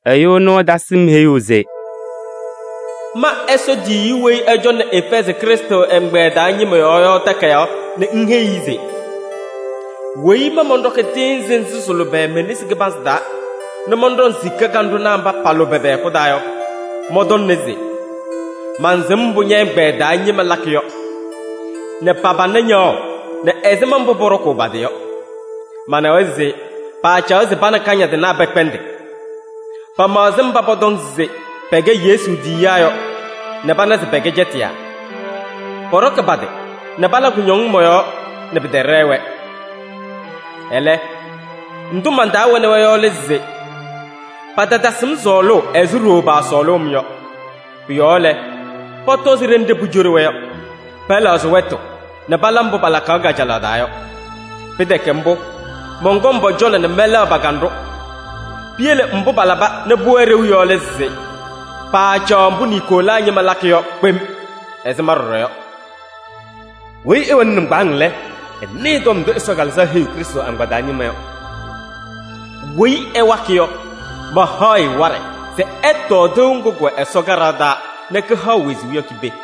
Ɛyʋ ɛnʋ ɛtasɩ-m heyuu se: “Ma Ɛsɔ tiyiyu weyi ɛcɔŋnɩ Efɛɛzɩ Krɩstʋ ɛgbɛyɛ taa ñɩma yɔɔ yɔ takayaɣ nɛ ŋheyi-i se: ‘Weyi ma mɔnɖɔkɩ tɩɩnzɩ nzɩ sɩ-lʋbɛ me-nesi kɩbanzɩ taa nɛ mɔnɖɔŋ sika kanɖʋnaa mba pa-lʋbɛ pɛ-hɛkʋ taa yɔ, mɔntɔŋna se: mansɩm mbʋ ñɛ-ɛgbɛyɛ taa ñɩma lakɩ yɔ nɛ pa-pana ñaɣʋ nɛ ɛzɩma mbʋ pɔɖɔkʋʋ pa-tɩ yɔ. Manawa se paacaɣ se pa nɛ kañadɩnaa pɛkpɛndɩ. Pamaɣzɩ mba pɔtɔŋ se pɛkɛ Yesu tiyiyaa yɔ nɛ pana se pɛkɛ cɛtɩyaa. Pɔɖɔkɩ pa-tɩ nɛ pala kʋñɔŋ mɔ-yɔɔ nɛ pɩtɛɖɛɛ-wɛ. Ɛlɛ, ndʋ man-taa wɛnɩ-wɛ yɔ lɛ se: patatasɩ-m sɔɔlʋʋ ɛzɩ ɖooo paasɔɔlʋʋ-m yɔ. Pʋ-yɔɔ lɛ, pɔtɔzɩ ɖenɖe pucoɖi-wɛ yɔ, pɛlɛɣzɩ wɛtʋ nɛ pala mbʋ palakaɣ kajalaɣ taa yɔ. Pɩtɛkɛ mbʋ, mɔnkɔŋ pɔ-cɔlɔ nɛ mɛlɛɣ pa-kanɖʋ. Piyele mbʋ palaba nɛ pʋwɛ ɖeu yɔ lɛ se: paacaɣ mbʋ Niikolaa ñɩma lakɩ yɔ kpem ɛzɩ ma ɖɔɖɔ yɔ. ‘Weyi ɛwɛnɩ nɩŋgbaaŋ lɛ, ɛnɩɩ ndʋ Ɛsɔ Kalɩzaɣ heyiɣ Krɩstʋ agbaa taa ñɩma yɔ! ‘Weyi ɛwakɩ yɔ, mahaɣ-ɩ waɖɛ se ɛtɔɔ tɩʋ ŋgʋ kʋwɛ Ɛsɔ kaɖaɣ taa nɛ kɩhaɣ wezuu yɔ ki-pee.’”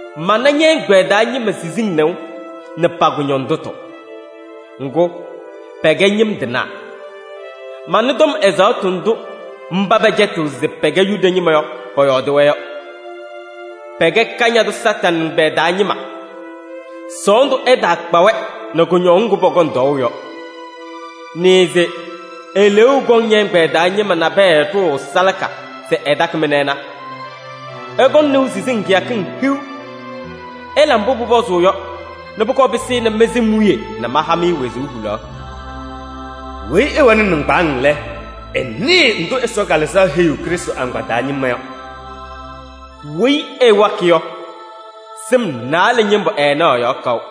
mana ñɛ-ɛgbɛyɛ taa ñɩma siziŋ nɩʋ nɛ pa-kʋñɔndʋtʋ. Ŋgʋ, pɛkɛ ñɩm tɩnaa! Manɩ tɔm ɛzaɣtʋ ndʋ mba pɛcɛtɩɣ se pɛkɛ Yuda ñɩma yɔ, pɔyɔɔdɩ-wɛ yɔ: pɛkɛ Kañadʋ Satanɩ ɛgbɛyɛ taa ñɩma! Sɔɔndʋ ɛtaakpa-wɛ nɛ kʋñɔŋ ŋgʋ pɔkɔŋ tɔɔʋ yɔ. Nɩɩ se eleeu kɔŋ ñɛ-ɛgbɛyɛ taa ñɩma nabɛyɛ ɖʋʋ salaka se ɛtakɩ-mɩ nɛ ɛna. Ɩkɔŋ nɩʋ siziŋ kɩyakɩŋ hiu. Ɩla mbʋ pʋpɔzʋʋ yɔ nɛ pʋkɔɔ pɩsɩnɩ mɩ-sɩm wiye nɛ maha-mɩ wezuu hulaɣ. ‘Weyi ɛwɛnɩ nɩŋgbaaŋ lɛ, ɛnɩɩ ndʋ Ɛsɔ Kalɩzaɣ heyiɣ Krɩstʋ agbaa taa ñɩma yɔ! ‘Weyi ɛwakɩ yɔ, sɩm naalɛ ñɩmbʋ ɛɛnaɣ ɛ-yɔɔ kaʋ.’”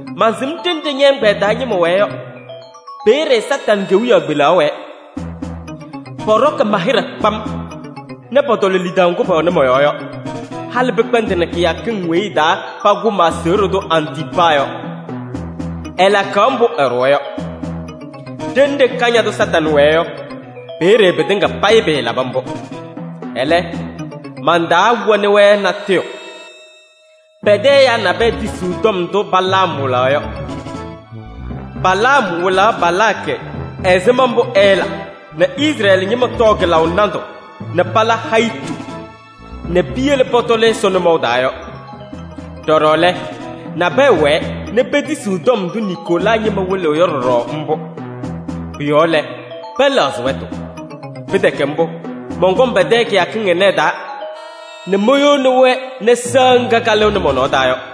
Mansɩm ɖenɖe ñɛ-ɛgbɛyɛ taa ñɩma wɛɛ yɔ: peeye Satanɩ kewiyaɣ kpelaɣ wɛɛ. Pɔɖɔkɩ ma-hɩɖɛ kpam nɛ pɔtɔlɔ lidaʋ ŋgʋ pɛwɛnɩ mɔ-yɔɔ yɔ, halɩ pɩkpɛndɩnɩ kɩyakɩŋ weyi ɩ-taa pakʋ ma-aseɣɖe tʋ Antiipaa yɔ. Ɛlakaɣ mbʋ ɛɖʋwa yɔ. Ɖenɖe Kañadʋ Satanɩ wɛɛ yɔ, peeye pɩtɩŋa payɩ pɩɩlaba mbʋ. Ɛlɛ, man-taa wɛnɩ-wɛ natʋyʋ: pɛ-tɛ ɛyaa nabɛyɛ tisiɣ tɔm ndʋ Balaam wɩlaɣ yɔ. Balaam wɩlaɣ Balaakɩ ɛzɩma mbʋ ɛɛla nɛ Izrɛɛlɩ ñɩma tɔɔ kɩlaʋ nandʋ nɛ pala hayitu nɛ piyele pɔtɔlɩ Ɛsɔ nʋmɔʋ taa yɔ. Ɖɔɖɔ lɛ, nabɛyɛ wɛɛ nɛ petisiɣ tɔm ndʋ Niikolaa ñɩma wɩlɩɣ yɔ ɖɔɖɔ mbʋ. Pʋ-yɔɔ lɛ, pɛlɛɣzɩ wɛtʋ. Pɩtɛkɛ mbʋ, mɔnkɔŋ pɛ-tɛ kɩyakɩŋ ɩnɛ ɩ-taa nɛ moyoni-wɛ nɛ sɩɣa ŋga kalɩɣnɩ mɔ-nɔɔ taa yɔ.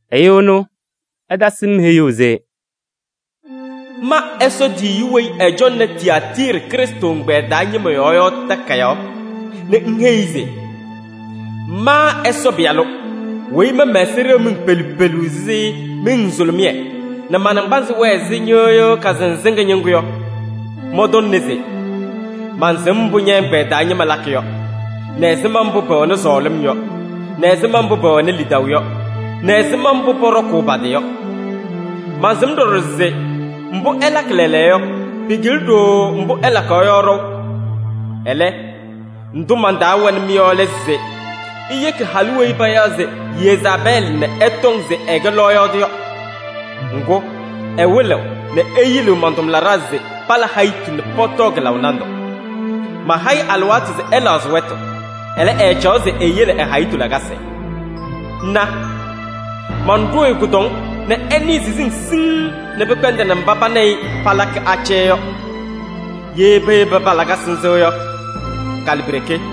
Ɛyʋ ɛnʋ ɛtasɩ-m heyuu se: “Ma Ɛsɔ tiyiyu weyi ɛcɔŋnɩ Tiyaatiiri Krɩstʋ ɛgbɛyɛ taa ñɩma yɔɔ yɔ takayaɣ nɛ ŋheyi-i se: ‘Ma Ɛsɔ Pɩyalʋ, weyi ma mɛ-ɛza ɖeɣ miŋ pelu pelu ɛzɩ miŋ nzʋlʋmɩyɛ nɛ ma-naŋgbanzɩ wɛɛ ɛzɩ ñɩɣyʋʋ kasɩnzɩŋa ñɩŋgʋ yɔ, mɔntɔŋna se: mansɩm mbʋ ñɛ-ɛgbɛyɛ taa ñɩma lakɩ yɔ, nɛ ɛzɩma mbʋ pɛwɛnɩ sɔɔlɩm yɔ, nɛ ɛzɩma mbʋ pɛwɛnɩ lidaʋ yɔ, nɛ ɛzɩma mbʋ pɔɖɔkʋʋ pa-tɩ yɔ. Mansɩm ɖɔɖɔ se mbʋ ɩlakɩ lɛɛlɛɛyɔ yɔ, pɩkɩlɩ ɖooo mbʋ ɩlakaɣ yɔ ɖɔʋ. Ɛlɛ, ndʋ man-taa wɛnɩ-mɩ yɔ lɛ se: iyeki halʋ weyi payaɣ se Yezaabɛɛlɩ nɛ ɛtɔŋ se ɛkɛ lɔɔyaɣ tʋ yɔ. Ŋgʋ, ɛwɩlɩɣ nɛ eyiliɣ man-tʋmlaɖaa se pala hayitu nɛ pɔtɔɔ kɩlaʋ nandʋ. Maha-ɩ alɩwaatʋ se ɛlɛɣzɩ wɛtʋ, ɛlɛ, ɛɛcaɣ se eyele ɛ-hayitu lakasɩ. Na! Manɖʋʋ-ɩ kʋdɔŋ nɛ ɛnɩɩ siziŋ siŋŋ nɛ pɩkpɛndɩnɩ mba pa nɛ ɩ palakɩ acɛyɛ yɔ. Ye peyebi pa-lakasɩ nzɩ yɔ, kalɩpiɖeke.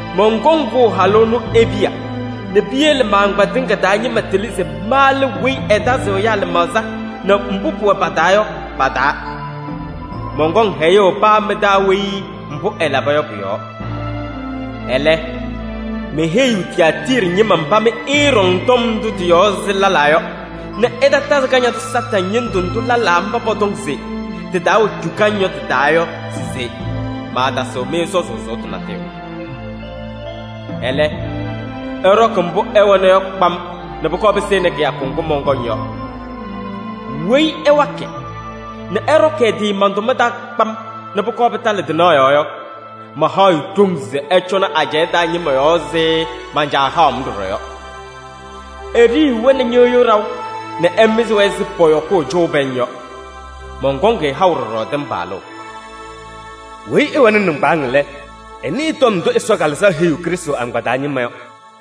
Mɔnkɔŋ kʋʋ halʋ ɛnʋ e-piya nɛ piyele ma-agbaa tɩŋa taa ñɩma tɩlɩ se ma lɛ weyi ɛtazɩɣ ɛyaa lɩmaɣza nɛ mbʋ pʋwɛ pa-taa yɔ pa-taa. Mɔnkɔŋ hɛyʋʋ paa mɩ-taa weyi mbʋ ɛlaba yɔ pʋ-yɔɔ. ‘Ɛlɛ, meheyiɣ Tiyaatiiri ñɩma mba mɩ ɩɩɖɔŋ tɔm ndʋ tɩ-yɔɔ ɛzɩ lɛlaa yɔ nɛ ɩtatazɩ Kañadʋ Satanɩ ñɩndʋ ndʋ lɛlaa mba pɔtɔŋ se tɩ-taa wɛ cukaŋ yɔ tɩ-taa yɔ se maatasɩɣ-mɩ sɔzʋʋ sʋʋtʋ natʋyʋ. Ɛlɛ, ɩɖɔkɩ mbʋ ɩwɛna yɔ kpam nɛ pʋkɔɔ pɩsɩnɩ kɩyakʋ ŋgʋ mɔnkɔŋ yɔ. ‘Weyi ɛwakɩ nɛ ɛɖɔkɩ ɛ-tɩ man-tʋma taa kpam nɛ pʋkɔɔ pɩtalɩ tɩnaɣ yɔɔ yɔ, mahaɣ-ɩ ɖoŋ se ɛcɔnɩ ajɛɛ taa ñɩma yɔɔ ɛzɩ man-Caa haʋ-m ɖɔɖɔ yɔ. Eɖiyiɣ-wɛ nɛ ñɩɣyʋʋ ɖaʋ nɛ ɛmɩzɩ-wɛ ɛzɩ pɔyɔkʋʋ cʋʋ pɛŋ yɔ. Mɔnkɔŋ-ɩ haʋ ɖɔɖɔ tɩmbalʋʋ. ‘Weyi ɛwɛnɩ nɩŋgbaaŋ lɛ, ɛnɩɩ tɔm ndʋ Ɛsɔ Kalɩzaɣ heyiɣ Krɩstʋ agbaa taa ñɩma yɔ!’”